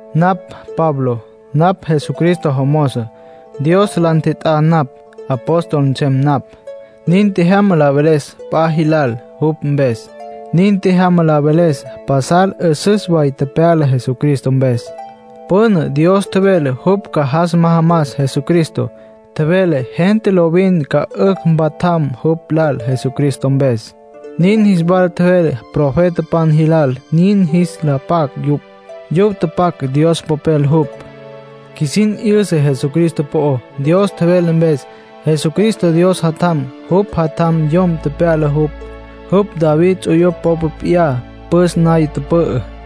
Napj Pablo. Napj Jesucristo jomozo. Dios la ntjet'á napj, apóstol nsem napj. Nin tjejyama la veles la p'a jilal jupj mpes. Nin tjejyama la veles pasal 'üsüs way tepyala Jesucristo mpes. Püna Dios tjevele jupj ca jas majamas Jesucristo, tjevele gente lovin ca 'ücj mpatjam jupj lal Jesucristo mpes. Nin jis wala tjevele profetapan jilal nin jis la pac yupj. Yupj tapac, Dios Popel jupj. Qjuisin 'yüsa Jesucristo po'ó, Dios tjevelá mpes. Jesucristo Dios Jatjam. Jupj Jatjam yom tepyala jupj. Jupj David ts'uyupj popa p'iyá püs naya tüpü'ü.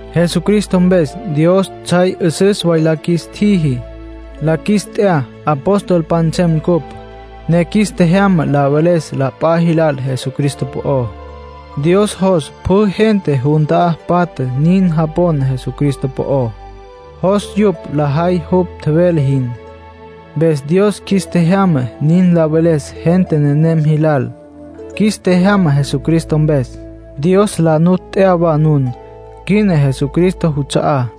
Jesucristo mpes Dios tsjay 'üsüs la qjuis tjiji. La qjuis t'ya, apostolpan nsem ncupj, ne qjuis tjejyama la veles la p'a jilal Jesucristo po'ó. Dios jos pjü gente jun ta'á patja nin japon Jesucristo po'ó. Jos yupj lajay jupj tjevele jin. Mpes Dios qjuis tjejyama nin la veles gente nenem jilal. Qjuis tjejyama Jesucristo mpes. Dios la nu t'ya wa nun. Quina nun Jesucristo juts'a'á.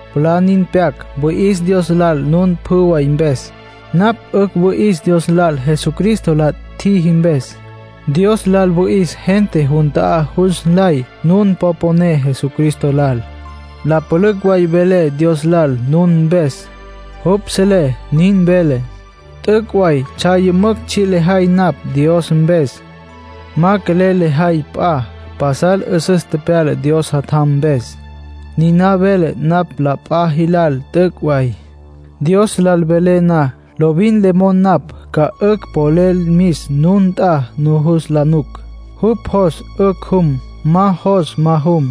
Mwalá nin pyac wüi'is Dios lal nun pjü way mpes. Napj 'ücj wüi'is Dios lal Jesucristo la tjiji mpes. Dios lal wüi'is gente jun ta'á jus nlay nun po poné Jesucristo lal. La pülücj way velé Dios lal nun mpes. Jupj selé nin velé. T'üc' way tsjay yümücj tsji' lejay napj Dios mpes. Ma quelel lejay p'a. Pasal 'üsüs tepyala Dios Jatjam mpes. Niná velé napj la p'a jilal, t'üc' way. Dios lal velé na, lovin le mon napj ca 'ücj polel mis nun nt'a nujus la nuc. Jupj jos, 'ücj jum. Ma jos, ma jum.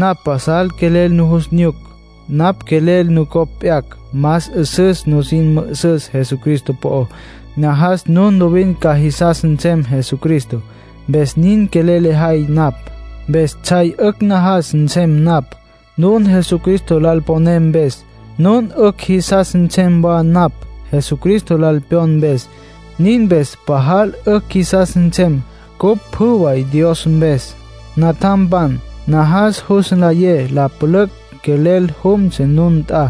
Napj pasal quelel nujus nyuc. Napj quelel nucopj p'yacj, más 'üsüs nusin mü'üsüs Jesucristo po'ó. Najas nun lovin ca jisas nsem Jesucristo, mpes nin quelel lejay napj. Mpes tsjay 'ücj najas nsem napj, nun Jesucristo lal poné mpes. Nun 'ücj jisas nsem wa napj Jesucristo lal pyon mpes. Nin mpes pajal 'ücj qjuisas nsem cupj pjü way Dios mpes. Natjampan, najas jus nlayé la pülücj quelel jumtsja nun nt'a.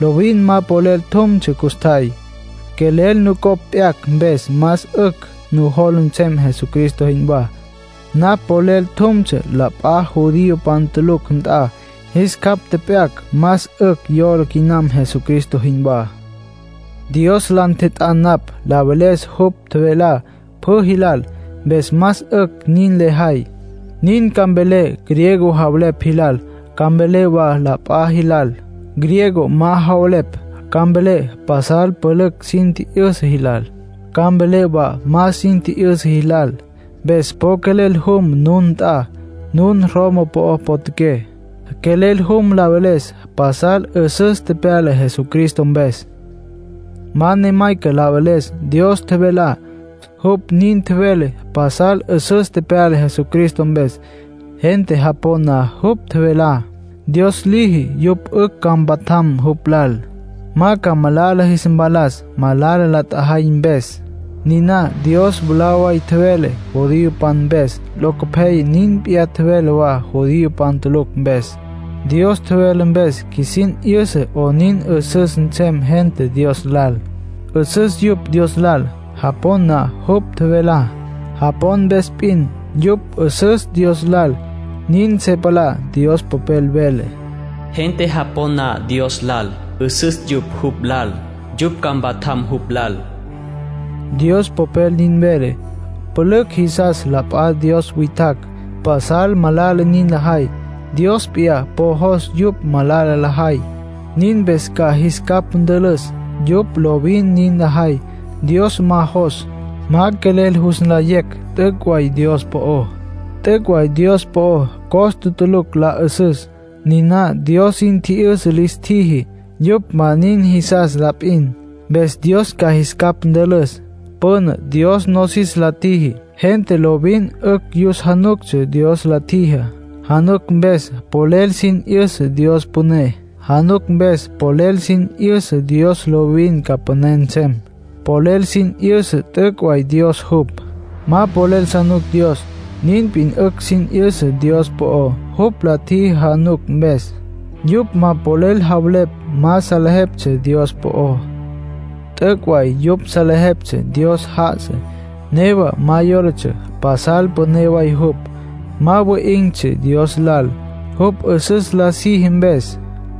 Lovin ma polel tjumtsja custjay. Quelel nucopj p'yacj, mpes más 'ücj nujola nsem Jesucristo jinwá. Napj polel tjumtsja la p'a judiopan tulucj nt'a. Jis capj tjep'yacj, más 'ücj yola quinam Jesucristo jinwá. Dios la ntjet'á napj la veles jupj tjevelá pjü jilal. Mpes más 'ücj nin lejay. Nin ca mvelé griego javelepj jilal. Ca mvelé wa la p'a jilal, griego ma javelepj. Ca mvelé pasal pülücj sin tji'yüsa jilal. Ca mvelé wa ma sin tji'yüsa jilal. Mpes po quelel jum nun nt'a, nun Roma po'ó potjaqué. Quelel jum la veles pasal 'üsüs tepyala Jesucristo mpes. Ma ne mayca la veles Dios tjevelá. Jupj nin tjevele pasal 'üsüs tepyala Jesucristo mpes. Gente japon na jupj tjevelá, Dios liji yupj 'ücj ca mpatjam jupj lal, ma ca malala jis mpalas malala la tjajay mpes. Niná Dios mwalá way tjevele judiopan mpes. Locopyaya nin p'iyá tjevele wa judiopan tulucj mpes. Dios tjevele mpes qjuisin 'yüsa 'onin 'üsüs nsem gente Dios lal. 'Üsüs yupj Dios lal, japon na jupj tjevelá. Japon mpes p'in, yupj 'üsüs Dios lal, nin se palá. Dios Popel vele: “Gente japon na Dios lal, 'üsüs yupj jupj lal. Yupj ca mpatjam jupj lal”, Dios Popel nin vele. Pülücj jisas la p'a dios witjacj; pasal malala nin lajay. Dios p'iyá po ma jos yupj malala lajay, nin mpes ca jis capj ntülüs. Yupj lovin nin lajay Dios ma jos. Ma quelel jus nlayecj t'üc' way Dios po'ó. T'üc' way Dios po'o, costa tulucj la 'üsüs. Niná Dios sin tji'yüsa lis tjiji. Yupj ma nin jisas la p'in. Mpes Dios ca jis capj ntülüs. Püna Dios nosis la tjiji. Gente lovin 'ücj yus januctsja Dios la tjijá. Januc mpes polel sin 'yüsa Dios püné. Januc mpes polel sin 'yüsa Dios lovin ca püné nsem. Polel sin 'yüsa t'üc' way Dios jupj. Ma polel sa nuc Dios, nin p'in 'ücj sin 'yüsa Dios po'ó jupj la tjiji januc mpes. Yupj ma polel javelepj ma salejeptsja Dios po'ó. T'üc' way yupj salejeptsja Dios já'asa. Newa ma yólatsja pasal püné way jupj. Ma wi'in̈tsja Dios lal jupj 'üsüs la siji mpes.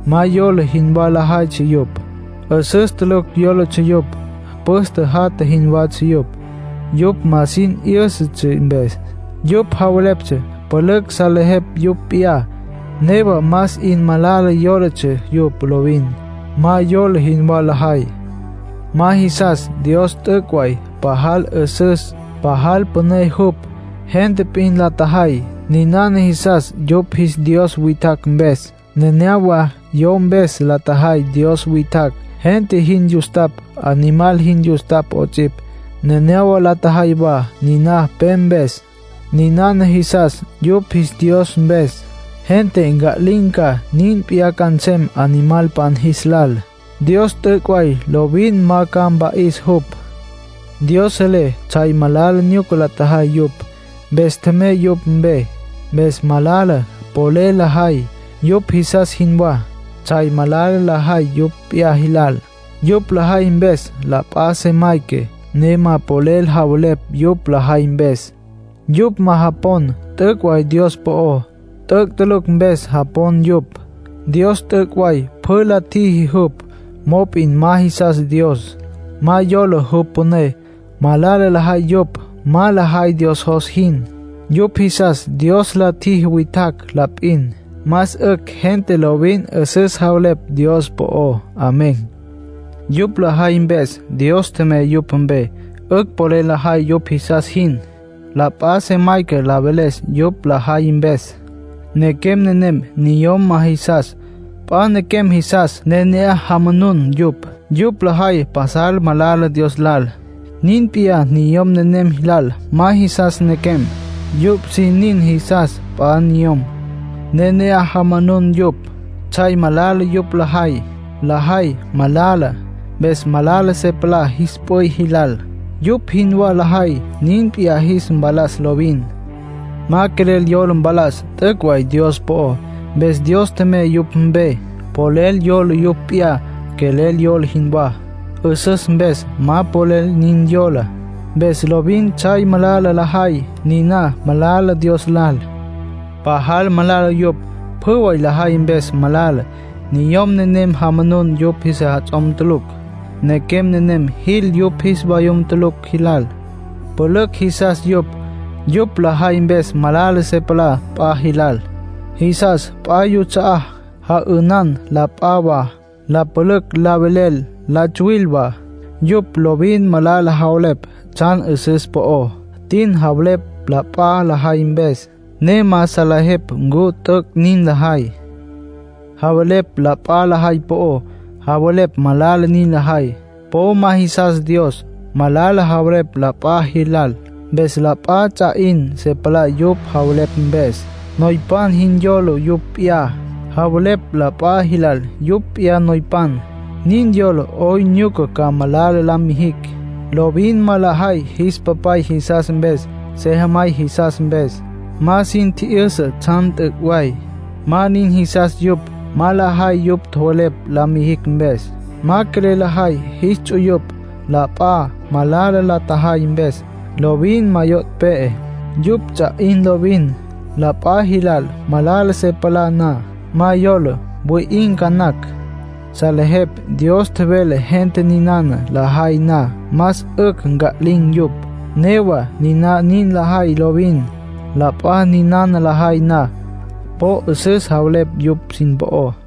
Ma yola jinwá lajaytsja yupj. 'Üsüs tulucj yólatsja yupj. Püste jatja jinwatsja yupj, yupj ma sin 'yǘsatsja mpes. Yupj javeleptsja pülücj salejepj yupj p'iyá, newa más 'in malala yólatsja yupj lovin. Ma yola jinwá lajay. Ma jisas Dios t'üc' way. Pajal 'üsüs, pajal püné jupj. Gente p'in la tjajay, ninana jisas yupj jis dios witjacj mpes. Nenéyawa yo mpes la tjajay dios witjacj, gente jin yustapj, animal jin yustapj 'ots'ipj. Nenéyawa la tjajay wa niná pe mpes. Ninana jisas yupj jis dios mpes. Gente nca'lin̈ ca, nin p'iyá ca nsem animalpan jis lal. Dios t'üc' way lovin ma ca mpa'is jupj. Dios selé tsjay malala nyuca la tjajay yupj. Mpes tjemey yupj mpe. Mpes malala polel lajay, yupj jisas jinwá. Tsjay malala lajay yupj p'iyá jilal. Yupj lajay mpes la p'a se mayca, ne ma polel javelepj yupj lajay mpes. Yupj ma japon t'üc' way Dios po'ó. T'üc' tulucj mpes japon yupj. Dios t'üc' way pjü la tjiji jupj, mop'in ma jisas Dios. Ma yola jupj püné. Malala lajay yupj. Ma lajay Dios jos jin. Yupj jisas Dios la tjiji witjacj la p'in. Más 'ücj gente lovin 'üsüs javelepj Dios po'ó. Amén. Yupj lajay mpes Dios tjemey yupj mpe. 'Ücj polel lajay yupj jisas jin. La p'a se mayca la veles yupj lajay mpes. Nequem nenem niyom ma jisas. P'a nequem jisas, ne ne'aj jamanun yupj. Yupj lajay pasal malala Dios lal. Nin p'iyá niyom nenem jilal. Ma jisas nequem. Yupj sin nin jisas p'a niyom, ne ne'aj jamanun yupj. Tsjay malala yupj lajay. Lajay malala, mpes malala se palá jis p'üy jilal. Yupj jinwá lajay, nin p'iyá jis mpalas lovin. Ma quelel yola mpalas t'üc' way Dios po'o. Mpes Dios tjemey yupj mpe. Polel yola yupj p'iyá quelel yola jinwá. 'Üsüs mpes ma polel nin yola. Mpes lovin tsjay malala lajay. Niná malala Dios lal. Pajal malala yupj. Pjü lajay mpes malala. Niyom nenem jamanun yupj sejats'om tulucj. Nequem nenem jil yupj jis vayum tulucj jilal. Pülücj jisas yupj. Yupj lajay mpes malala se palá la p'a jilal. Jisas p'a yuts'a'á. Ja'ünan la p'a wa. La pülücj la velel. La tsuwil wa. Yupj lovin malala javelepj tsjan 'üsüs po'ó. Tin javelepj la p'a lajay mpes, ne ma salejepj ncu t'üc' nin lajay. Javelepj la p'a lajay po'ó, javelepj malala nin lajay. Po ma jisas Dios. Malala javelepj la p'a jilal, mpes la p'a ts'a 'in se palá yupj javelepj mpes. Noypan jin yola yupj p'iyá. Javelepj la p'a jilal yupj p'iyá noypan. Nin yola 'oyn nyuca ca malala la mijicj. Lovin ma lajay jis papay jisas mpes, sejamay jisas mpes. Ma sin tji'yüsa tsjan t'üc' way. Ma nin jisas yupj. Ma lajay yupj tjowelepj la mijicj mpes. Ma quelel lajay jis ts'uyupj. La p'a malala la tjajay mpes, lovin ma yo' pe'e; yupj ts'a 'in lovin. La p'a jilal malala se palá na, ma yola; wi'in̈ ca nacj. Salejepj Dios tjevele gente ninana lajay na más 'ücj nca'lin̈ yupj. Newa niná nin lajay lovin. La p'a ninana lajay na, po 'üsüs javelepj yupj sin po'ó.